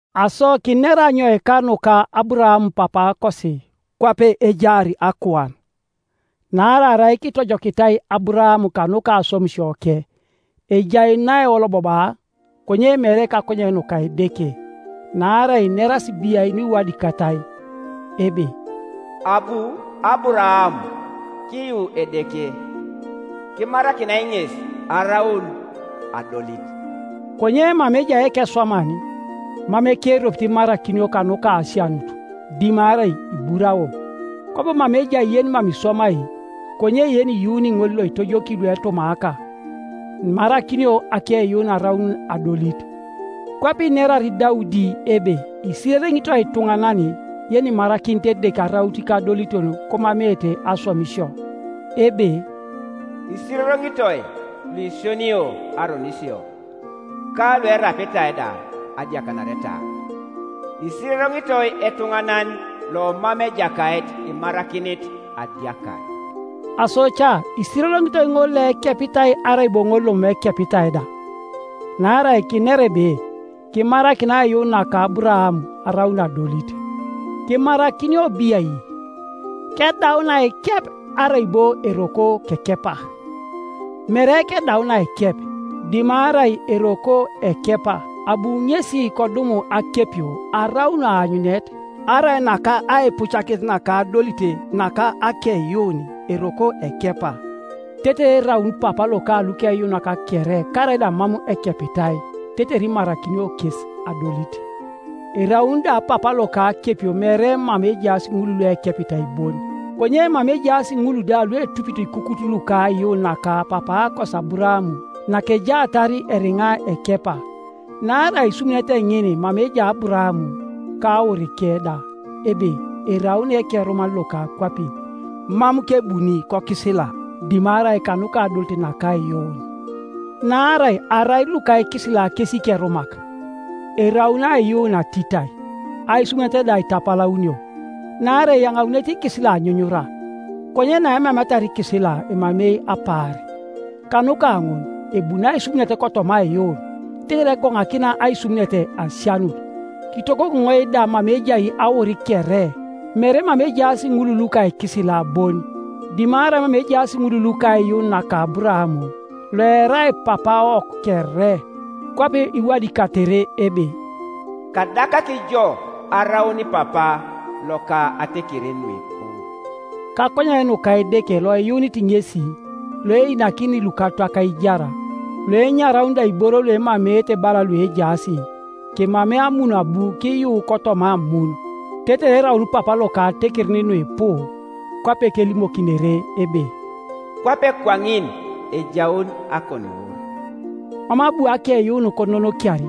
Aso kinera anyoika nuka Aburaam papaakosi kwape ejaar akuan? Naarai arai kitojokitai Aburaam kanuka aswamisioke, ejai naeolobobaa, konye mere kakonyen nuka Edeke. Naarai inerasi biai nuiwadikatai? Ebe, “Abu Aburaam kiyu Edeke, kimarakinai ŋes araun adolit.” Konye mama ejai ekeswaman, mam ekeropit imarakinio kanuka asianut, dimarai iburao. Kwabo mama ejai yenimam iswamai, konye iyuuni ŋol loitojoki luetumaaka, imarakinio akeiyuun araun adolit. Kwape inerar Daudi ebe isirereŋitoi ituŋanan yenimarakinit Edeke araun ikadoliton komameete aswamisio; Ebe, “Isirereŋitoi luisionio aronisio, ka luerapitai da adiakanareta; Isirereŋitoi etuŋanan lomam Ejakait imarakinit adiakar.” Aso ca isirereŋitoi ŋol loekepitai arai bo ŋol lomam ekepitai da? Naarai kinera ebe, Kimarakinai aiyuun naka Aburaam araun adolit. Kimarakinio biai? Kedaun aikep, arai bo eroko kekepa? Mere kedaun aikep, dimarai eroko ekepa. Abu ŋesi kodum akepio araun aanyunet arai nakaipucakinet naka adolit naka akeiyuun eroko ekepa, tetere eraun papa loka lukeyuunak kere karaida mam ekepitai, tetere imarakinio kes adolit. Eraun da papa loka akepio mere mama ejaas ŋul luekepitai bon, konye mama ejaas ŋul da luetupito ikukut luka aiyuun naka papaakosi Aburaam nakejaatar eriŋa ekepa. Naarai aisumunet ŋin mama ejai Aburaam ka aurike da ebe eraun ekeruman loka akwapin, mam kebuni kokisila, dimarai kanuka adolit naka aiyuun. Naarai arai luka ikisila kes ikerumak, eraun aiyuun atitai, aisumunet da itapalaunio. Naarai eyaŋaunete ikisila anyunyura, konye naemameatar ikisila emamei apaar. Kanuka ŋun ebuni aisumunet kotoma aiyuun, tetere egoŋakina aisumunet asianut, kitogogoŋoi da mama ejai aur kere, mere mama ejaas ŋul luka ikisila bon, dimarai mama ejaas ŋul luka aiyuun naka Aburaam, (loerai papaawok kere, kwape iwadikatere ebe, “Kadakaki jo araun papa loka atekerin nuipu,”) kakonyen nuka Edeke loiyuunit ŋesi, loeinakini lukatwak aijar, loenyarauni da iboro luemameete bala luejaas. Kemamei amun abu kiyuu kotoma amun, tetere eraun papa loka atekerin nuipu; kwape kelimokinere ebe, “Kwape kwaŋin ejaun akoniwur.” Mam abu akeiyuun kononokiar,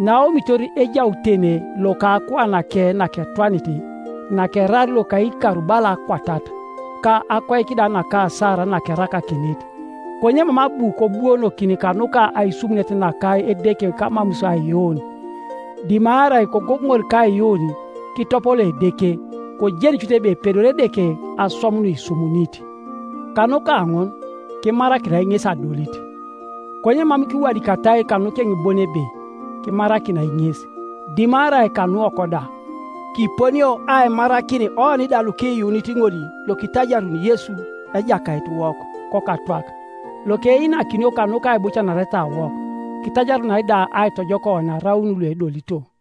naaomitor ejautene loka akuanake naketwanit, nakeraar loka ikar bala akwatat, ka akoik da naka Sara nakerakakinit, konye mam abu kobuonokin kanuka aisumunet naka Edeke kamamus aiyuun, dimarai kogogoŋor kaiyuun, kitopoloo Edeke, kojeni cut ebe epedori Edeke aswam nuisumunit. Kanuka ŋun, “kimarakinai ŋes adolit.” Konye mam kiwadikatai kanukeŋ bon ebe, “Kimarakinai ŋes”, dimarai kanuwok da, Kiponio aimarakin oni da lukiyuunit ŋol lokitajaruni Yesu Ejakaitiwok kokatwak, lokeinakinio kanuka aibucanaretawok, kitajarunai da aitojok oni araun luedolito.